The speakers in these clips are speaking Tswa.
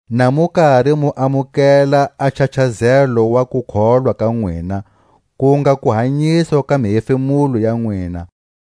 na mu kari mu amukela a nchachazelo wa kukholwa ka nwina, ku nga kuhanyiswa ka mihefemulo ya nwina.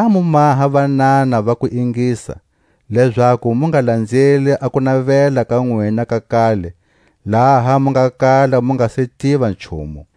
Ngha mu maha vanana va kuingisa; lezaku mu nga lanzeli a kunavela ka nwina ka kale, laha mu nga kala mu nga se tiva nchumu.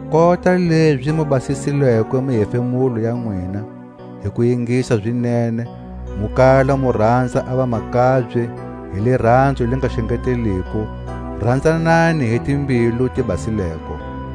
Kota lezi mu basisileko mihefemulo ya nwina hi ku ingisa zinene, mu kala mu ranza a vamakabye hi liranzo li nga xengeteliko, ranzanani hi timbilu ti basileko.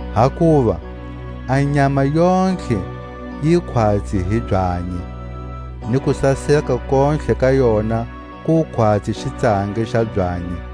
Hakuva: A nyama yontlhe yi khwatsi i byanyi, Ni kusaseka kontlhe ka yona ku khwatsi xitsangi xa byanyi,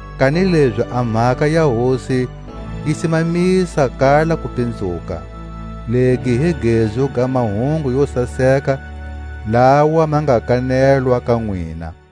Kanilezi a mhaka ya Hosi yi simamisa kala kupinzuka. Legi hi gezu ga mahungu yo saseka lawa ma nga kanelwa ka nwina.